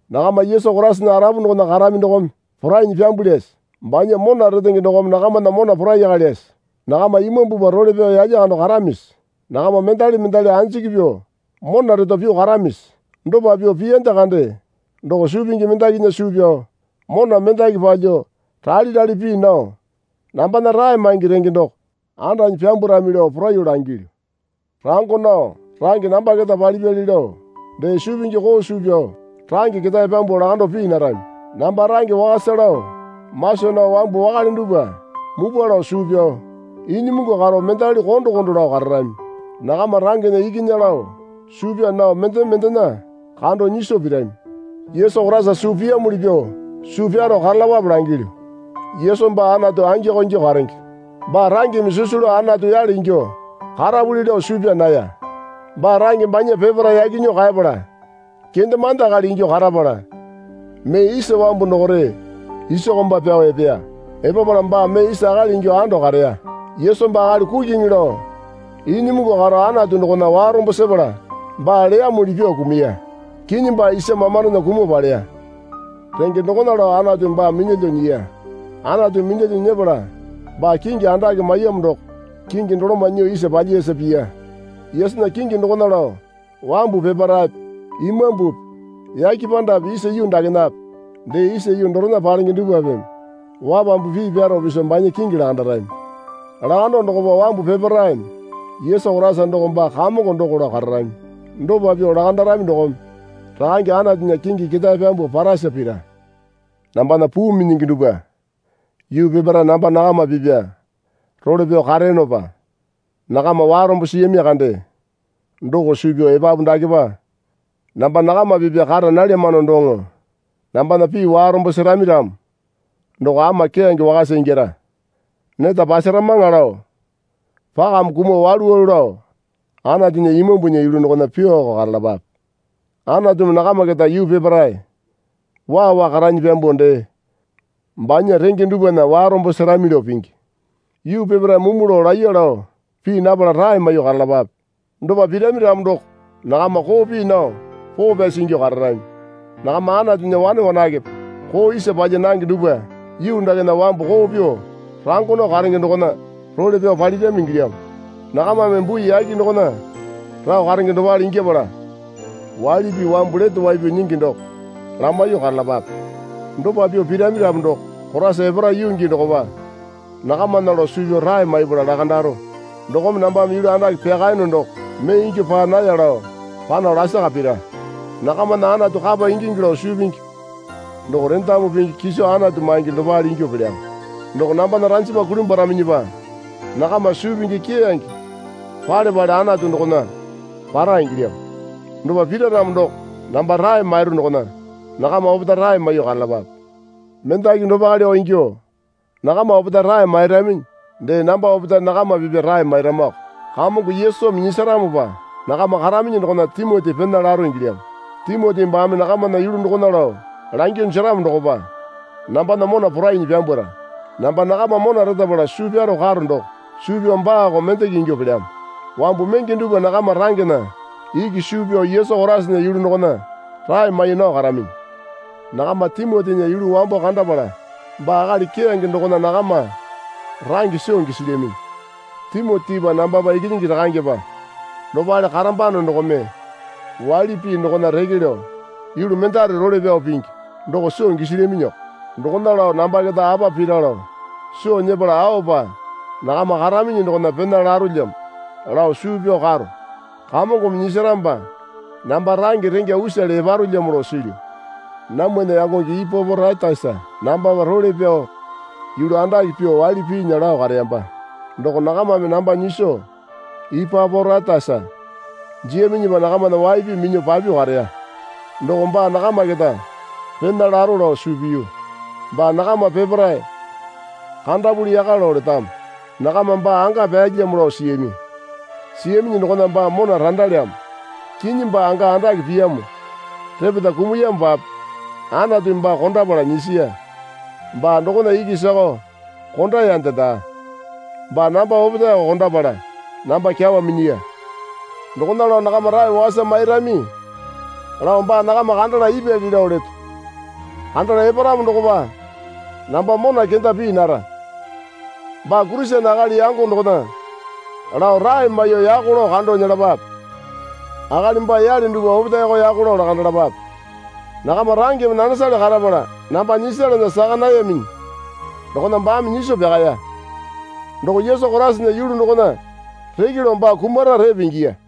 Nakama Yesu Koraisana arapu dokona karami dokome porainyi pyambulyase? Banya mona retenge dokome nakamana mona poraikalyase? Nakama Imambupa role pyao yalya kando karamisi? Nakama mendali mendali anjiki pyuo mona reto pyuo karamisi? Dopa pyuo piyande kande doko suu pingi mendakinya suu pyao mona mendaki palyuo rale rale pii nao nambana rae maingi renge doko andanyi pyambwarami lao poraiyuo langilyu. Rango nao range namba keta palipyali lao dee suu pingi koo suu pyao range ketae pyambuo lakando pii narami. Namba range wakasa lao masa nao wambu wakale dupwa mupwa lao suu pyao inyimungu karo mendali kondo kondo lao kararami. Nakama rangena ikinya lao suu pyaa nao mendeme mendena kando nyiso pirami. Yesu Koraisa suu piyamuli pyuo suu pyaro karalapape langilyu. Yesu baa Anatu angiko ingyuo karenge. Baa rangeme sisu lao Anatu yale ingyuo karapuli lao suu pyaa naya. Baa range banya peparae yaki nyuo kaepala kendemande akali ingyuo karapala mee isa wambu dokore isa komba pyao epeya. Epapala baa mee isa akali ingyuo ando kareya. Yesu baa akali kukiŋi lao inyimungu karo Anatu dokona warombo sepala baa leyamuli pyuo kumuya. Kinyi baa isa mamandona kumuo paleya. Renge dokona lao Anatumi baa minyalyuo nyiya. Anatumi minyalyuo nyepala baa kingi andake maiyamo doko kingi doloma nyuo isa palyiyasa piya. Yesunya kingi dokona lao wambu peparaepe imambupi yake pandape isa yuu dakenape dee isa yuu dorena palenge dupwapeme wapambu pii pyaro piso banya kingi lakandarami. Lakando dokopa wambu peparaeme Yesu Koraisa doko baa Kamongo doko lao kararami. Dopa pyuo lakandarami dokome Rakange Anatunya kingi ketae pyambuo parasa pira. Nambana puu minyingi dupwa yuu peparae namba nakama pipya role pyao kareyonopa nakama warombo siyami kande. Doko suu pyao epapu dakepa namba nakama pipya kara nalyamano doŋo nambana pii warombo serami ramo doko ama keyange wakasa ingyara. Neta pasaramaŋa lao pakame kumuo walu walu lao Anatunya Imambunya yulu dokona pyuoko karalapape. Anatumi nakama keta yuu peparae waa waa karanyi pyambuo dee banya renge dupwana warombo serami lao pingi. Yuu peparae mumu lao laiya lao pii napala rae maiyuo karalapape. Dopa pirami ramo doko nakama koo pii nao poo pyasi ingyuo kararami. Nakama Anatunya wane wanakepe koo isa palya nange dupwa yuu dakena wambu koo pyuo rango nao karenge dokona role pyao palirami ingilyamo. Nakamame bui yake dokona rao karenge dopale ingyapala, waili pii wambu lete wai pyao nyingi doko lamaiyuo karalapape. Dopa pyuo pirami ramo doko Koraisa epara yuu gii dokopa nakamana lao suu pyao rae maipala lakandaro. Dokome nambame yulu andake pyakayono doko mee ingyuo paa naya lao pano lasaka pira. Nakamana Anatu kapa ingingi lao suu pingi doko rendamu pingi kiso Anatu maingi dopale ingyuo pelyamo. Doko nambana ranjama kulimbwaraminyipa nakama suu pingi keyange pale pale Anatu dokona para ingilyamo. Dopa pira ramo doko namba rae mairu dokona nakama opetae rae maiyuo karalapape. Mendaki dopaleko ingyuo nakama opetae rae mairaminyi dee namba opetae nakama pipya rae mairamako. Kamongo Yesumi nyisaramopa nakama karaminyi dokona Timoti pena laro ingilyamo. Timoti baame nakamana yulu dokona lao langyuo jeramo dokopa nambana mona porainyi pyambwara. Namba nakama mona retapala suu pyaro karo doko suu pyao baako mendeke ingyuo pelyamo. Wambu menge dupwa nakama rangena iki suu pyao Yesu Koraisana yulu dokona rae mai nao karaminyi. Nakama Timotinya yulu wambo kandapala baa akali keyange dokona nakama range soo gisilyaminyi. Timotipa nambapa ikinyingi rakangepa dopale karambano dokome waili pii dokona reke lao yulu mendare role pyao pingi doko soo gisilyaminyiko. Dokona lao namba keta apa pira lao soo nyepala aopa nakama karaminyi dokona pena larolyamo lao suu pyao karo. Kamongome nyisaramopa namba range rengya usale eparolyamo lao silyu. Namwana yangonge Ipaporaitasa nambapa role pyao yulu andake pyuo waili piinya lao kareyamba. Doko nakamame namba nyiso Ipaporaitasa jiyaminyipa nakamana wai pii minyuo papyuo kareya. Doko baa nakama keta pena laro lao suu piyu. Baa nakama peparae kandapuli yaka lao letamo. Nakama baa anga pyalyamo lao siyami. Siyaminyi dokona baa mona randalyamo. Kinyi baa anga andake piyamo repeta kumuyamopape Anatumi baa kondapala nyisiya. Baa dokona iki sakao kondayande daa. Baa namba opetaeko kondapala namba kyawa minyiya. Dokona lao nakama rae wakasa mairami lao baa nakama kandala ipyali lao leto. Kandala eparamo dokopa namba mona kenda pii nara. Baa Kurisene akali yango dokona lao rae maiyuo yako lao kando nyelapape. Akali baa yale dupwa opetaeko yako lao lakandalapape. Nakama rangeme nanesale karapala namba nyisalana saka nayaminyi dokona baame nyiso pyakaya. Doko Yesu Koraisana yulu dokona reke lao baa kumara repe ingiya.